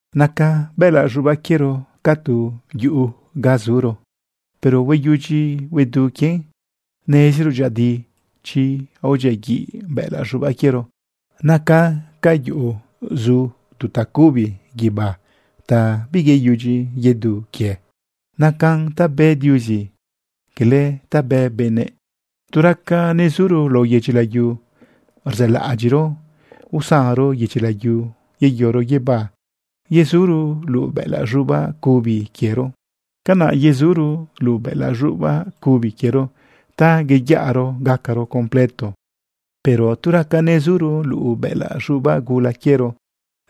Naca bëꞌëlaꞌ z̃ubaꞌ quiero ca quie tu yuꞌu ga zuro, pero hueyudyi huedu quien. Neziro dyëꞌëdi chi aodyiaguiꞌ bëꞌëlaꞌ z̃ubaꞌ quiero naca ca yuꞌu, zu tu tacubi guibá ta biyeyudyi yedu quie. Nacan ta bë Diuzi, cala ta bë benëꞌ. Tu raca nezuro lao yedyi layu, rzëlaꞌadyiꞌro usanro yedyi layu yeyoro guibá yezuro luꞌu bëꞌëlaꞌ z̃ubaꞌ cubi quiero. Canaꞌ yezuro luꞌu bëꞌëlaꞌ z̃ubaꞌ cubi quiero ta iyaꞌro gacaro completo. Pero tu raca nezuro luꞌu bëꞌëlaꞌ z̃ubaꞌ gula quiero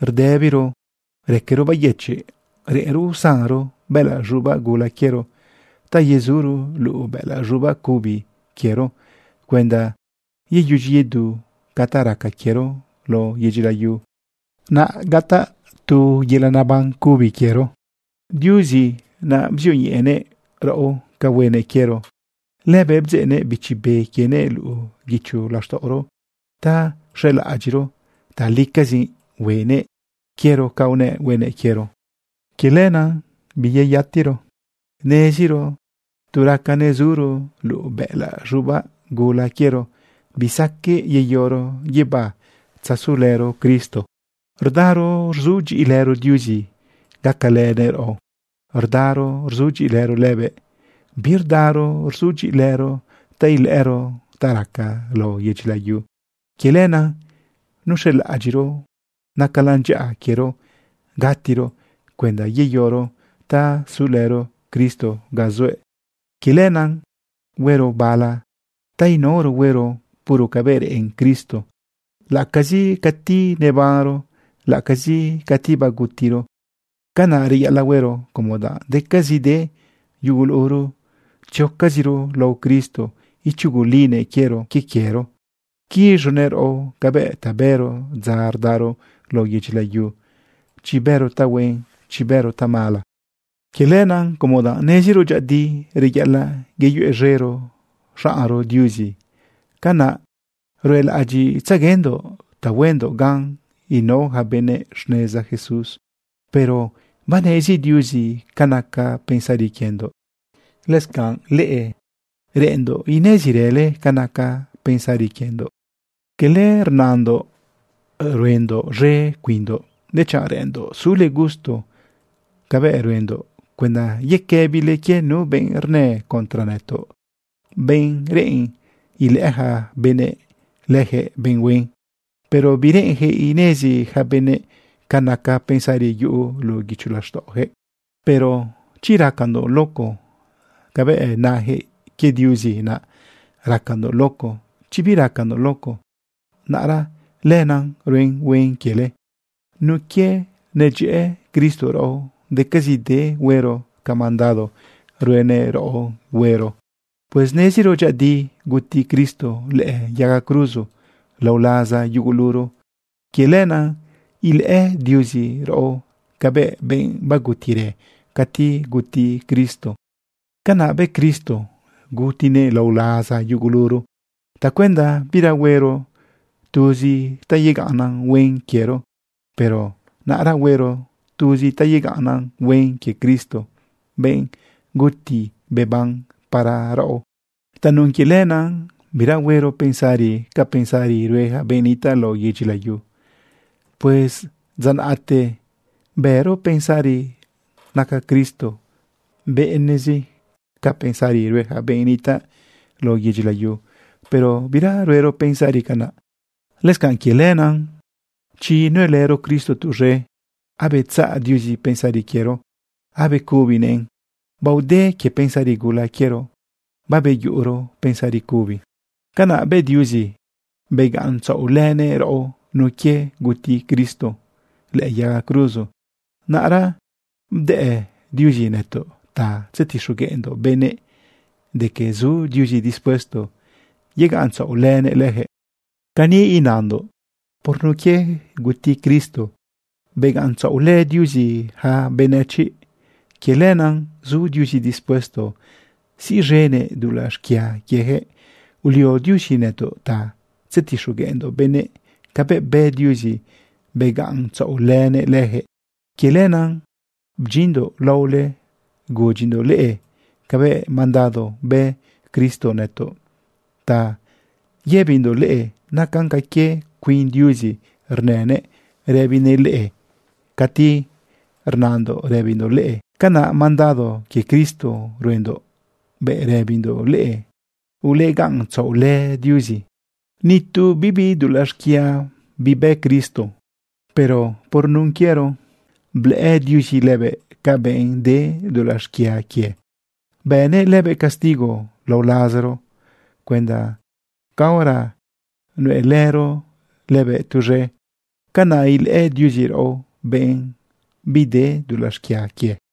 rdëbiro raquero bayëchiꞌ. Reꞌenro usanro bëꞌëlaꞌ z̃ubaꞌ gula quiero ta yezuro luꞌu bëꞌëlaꞌ z̃ubaꞌ cubi quiero cuenda yeyudyi yedu ca ta raca quiero lao yedyi layu, naꞌ gataꞌ tu yelaꞌ neban cubi quiero. Diuzi naꞌ bzioñeꞌenëꞌ raꞌo ca huenëꞌ quiero. Lëbëꞌ bdzeꞌnëꞌ Bichi Be quienëꞌ luꞌu guicho laxtaꞌoro ta xelaꞌadyiꞌro talicazi huenëꞌ quiero ca unëꞌ huenëꞌ quiero. Quie lenaꞌ biyeyatero. Neziro tu raca nezuro luꞌu bëꞌëlaꞌ z̃ubaꞌ gula quiero, bisaqueꞌ yeyoro guibá tzasulëro Cristo. Rdaro rzudyiꞌilëro Diuzi gacalënëꞌ raꞌo. Rdaro rzudyiꞌilëro lëbëꞌ, birdaro rzudyiꞌilëro ta ilëꞌëro ta raca lao yedyi layu. Quie lenaꞌ nuxelaꞌadyiꞌro nacalan dyaꞌa quiero gatiro cuenda yeyoro ta sulëro Cristo ga zuëꞌ. Quie lenaꞌ, huero bala ta inaoro huero puro cabëꞌ reꞌen Cristo, laꞌacazi cati nebanro, laꞌacazi cati bagutiro. Canaꞌ reyaꞌalaꞌ huero como danꞌ decazide yuguluro tziocaziro lao Cristo ichugulinëꞌ quiero quie quiero, quiz̃unëꞌ raꞌo cabëꞌ ta bëro dza rdaro lao yedyi layu, chi bëro tahuen, chi bëro tamala. Quie lenaꞌ como danꞌ neziro dyëꞌëdi reyaꞌalaꞌ yeyuez̃ero xaꞌnro Diuzi, canaꞌ ruelaꞌadyiꞌtzeguendoꞌ ta huendoꞌ gan inao ja benëꞌ xneza Jesús. Pero banezi Diuzi ca naca pensari quiendoꞌ. Lëscanꞌ leꞌe, reꞌ enndoꞌ inezirële ca naca pensari quiendoꞌ. Cala rnandoꞌ ruendoꞌ z̃e cuinndoꞌ, dechanꞌ reꞌenndoꞌ sule gusto cabëꞌ ruendoꞌ cuenda yequëbile quie nu benꞌ rnë contra nëtoꞌ, benꞌ reꞌen ilëꞌë ja benëꞌ lëjëꞌ benꞌ huen, pero bireꞌenjëꞌ inezi ja benëꞌ ca naca pensari yuꞌu luꞌu guicho laxtaꞌojëꞌ. Pero chi racandoꞌ luco cabëꞌ najëꞌ, quie Diuzi naꞌ racandoꞌ luco. Chi biracandoꞌ luco, naꞌra lenaꞌ ruen huen quiele. Nun quie nedyëꞌë Cristo raꞌo, decazide huero ca mandado ruenëꞌ raꞌo huero. Pues neziro dyëꞌëdi guti Cristo lëꞌë yaga cruzo lao laza yuguluro. Quie lenaꞌ ilëꞌë Diuzi raꞌo cabëꞌ benꞌ bagutirë cati guti Cristo. Canaꞌ bë Cristo, gutinëꞌ lao laza yuguluro tacuenda bira huero tuz ta yegaꞌnnan huen quiero, pero naꞌra huero tuz ta yegaꞌnnan huen quie Cristo, benꞌ guti beban para raꞌo. Tanun quie lenaꞌ, bira huero pensari ca pensari rue ja benꞌ nitaꞌ lao yedyi layu. Pues dza naꞌte bëro pensari naca Cristo benëꞌzi ca pensari rue ja benꞌ nitaꞌ lao yedyi layu, pero bira ruero pensari canaꞌ. Lëscanꞌ quie lenaꞌ, chi nuelëro Cristo tuz̃e, abetzaꞌ Diuzi pensari quiero, abecubinëꞌn. Baode quie pensari gula quiero, babeyuꞌuro pensari cubi. Canaꞌ bë Diuzi begaꞌ ntzaꞌolënëꞌ raꞌo nun quie guti Cristo lëꞌë yaga cruzo. Naꞌra bdëꞌ Diuzi nëtoꞌ ta tzetixogueꞌndoꞌ benëꞌ de que zu Diuzi dispuesto yegaꞌntzaꞌolënëꞌ lëjëꞌ. Cani inandoꞌ: Por nun quie guti Cristo, begaꞌntzaꞌolë Diuzi yaca benëchiꞌ. Quie lenaꞌ zu Diuzi dispuesto siꞌz̃enëꞌ dulaꞌ xquia quiejëꞌ. Ulio Diuzi nëtoꞌ ta tzetixogueꞌndoꞌ benëꞌ cabëꞌ bë Diuzi begaꞌntzaꞌolënëꞌ lëjëꞌ. Quie lenaꞌ bdyinndoꞌ laole gudyindoꞌ leꞌe cabëꞌ mandado bë Cristo nëtoꞌ ta yëbindoꞌ leꞌe. Nacan ca quie cuin Diuzi rnënëꞌ rëbinëꞌ leꞌe cati rnandoꞌ rëbindoꞌ leꞌe. Canaꞌ mandado quie Cristo ruendoꞌ bëꞌ rëbindoꞌ leꞌe: Ulegaꞌntzaꞌolë Diuzi. Ni tu bibi dulaꞌ xquia bibë Cristo. Pero por nun quiero blëꞌë Diuzi lëbëꞌ ca benꞌ de dulaꞌ xquia quie, bënëꞌ lëbëꞌ castigo lao lazaro cuenda caora nuelëro lëbëꞌ tuz̃e, canaꞌ ilëꞌë Diuzi raꞌo benꞌ bide dulaꞌ xquia quie.